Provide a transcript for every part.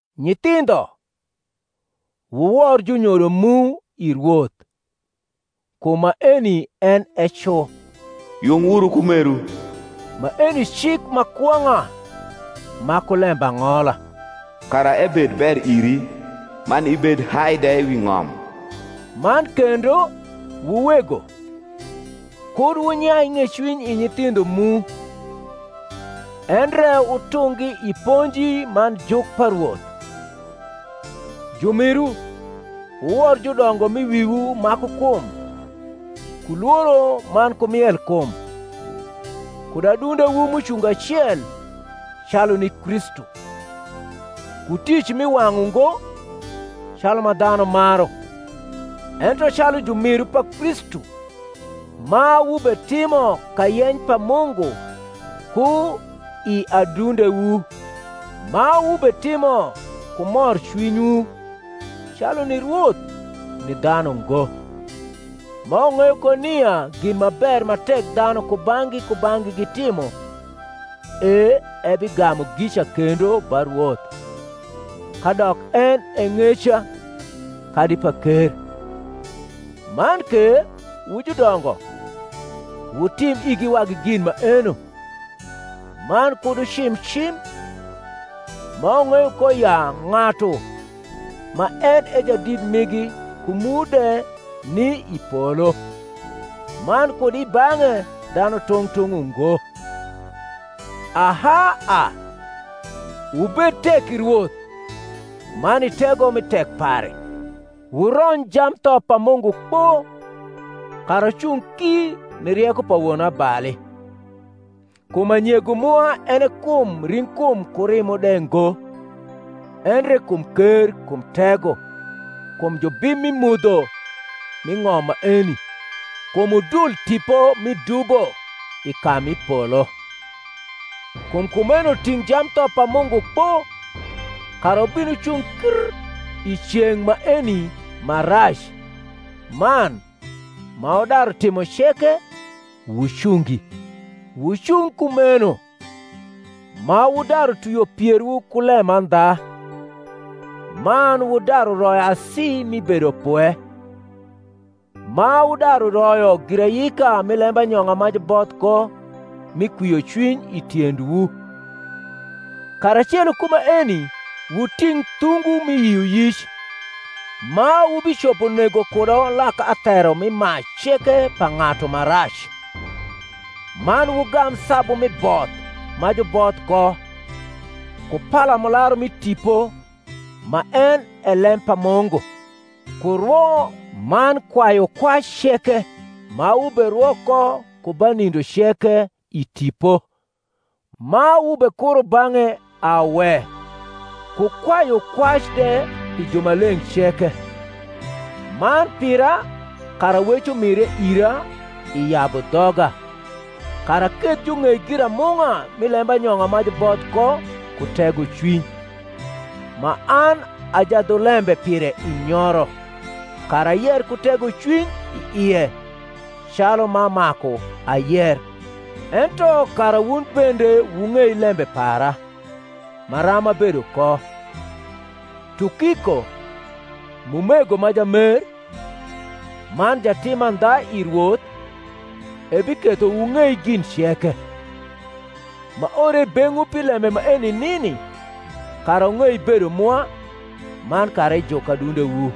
Nyithindho, wuwor junyodo mu i Rwoth: kum maeni en e cu. Yung wuru ku meru (maeni cik ma kwong’a ma ku lembang’ola), kara ebed ber iri, man ibed hai de wi ng’om. Man kendo, wu wego, kud wunyai ng’ecwiny i nyithindho mu: endre wutunggi i ponji man juk pa Rwoth. Jumiru, wuwor judongo m’i wiwu ma ku kum, ku lworo man ku mielkum, kud adundewu m’ucungo acel, calu ni Kristu; ku tic mi wang’ ungo, calu ma dhanu maru; ento calu jumiru pa Kristu, ma wubetimo kayeny pa Mungu ku i adundewu: ma wubetimo ku morcwinywu, calu ni Rwoth, ni dhanu ngo: ma wung’eyo ko nia gin ma ber ma tek dhanu kubang’gi kubang’gi gitimo, e ebigamu gica kendo ba Rwoth, kadok en e ng’eca kadi paker. Man ke, wu judongo, wutim igi wagi gin maeno, man kud wucim cim: ma wung’eyo ko ya ng’atu ma en e Jadit migi ku mu de ni i polo, man kud i bang’e dhanu tung’ tung’ ungo. Aha a, wubed tek i Rwoth, man i tego mi tek pare. Wurony jamtho pa Mungu kpo, kara wucung ki ni rieko pa wonabali. Kum anyego mwa en e kum ring’kum ku rimo de ngo, endre kum ker, kum tego, kum jubim mi mudho mi ng’om maeni, kum udul tipo mi dubo i ka mi polo. Kum kumeno ting’ jamtho pa Mungu kpo, kara wubin wucung kr i ceng’ maeni ma rac, man, ma wudaru timo ceke, wucungi. Wucung kumeno, ma wudaru twio pierwu ku lemandha, man wudaru royo asi mi bedopwe, ma wudaru royo girayika mi lembanyong’a ma juboth ko mi kwiocwiny i tiendwu; karacelo ku maeni wuting’ thungu mi yioyic, ma wubicopo nego ku.. do lak athero mi mac ceke pa ng’atu ma rac. Man wugam sabu mi both ma juboth ko, ku palamularu mi Tipo, ma en e lem pa Mungu: ku rwo man kwayukwac ceke ma wuberwo ko ku ba nindo ceke i Tipo, ma wubekuro bang’e awe, ku kwayu kwac de pi jumaleng’ ceke, man pira, kara wec umire ira i yabu dhoga, kara aketh jung’ei giramung’a mi lembanyong’a ma juboth ko ku tegocwiny, ma an a jadhulembe pire i nyoro; kara ayer ku tegocwiuy i ie, calu ma maku ayer. Ento kara wun bende wung’ei lembe para, maram abedo ko, Tukiko, m’umego ma jamer, man jatim mandha i Rwoth, ebiketho wung’ei gin ceke: m’aore i beng’wu pi lembe maeni nini, kara wung’ei bedo mwa, man kara ejuk adundewu.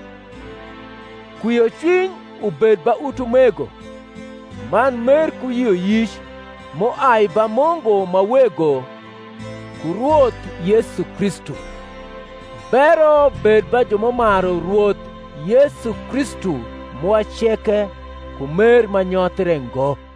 Kwiocwiny ubed ba utumego, man mer ku yioyic, m’uai ba Mungu ma Wego ku Rwoth Yesu Kristu. Bero bed ba ju m’umaru Rwoth Yesu Kristu mwa ceke ku mer ma nyothre ngo.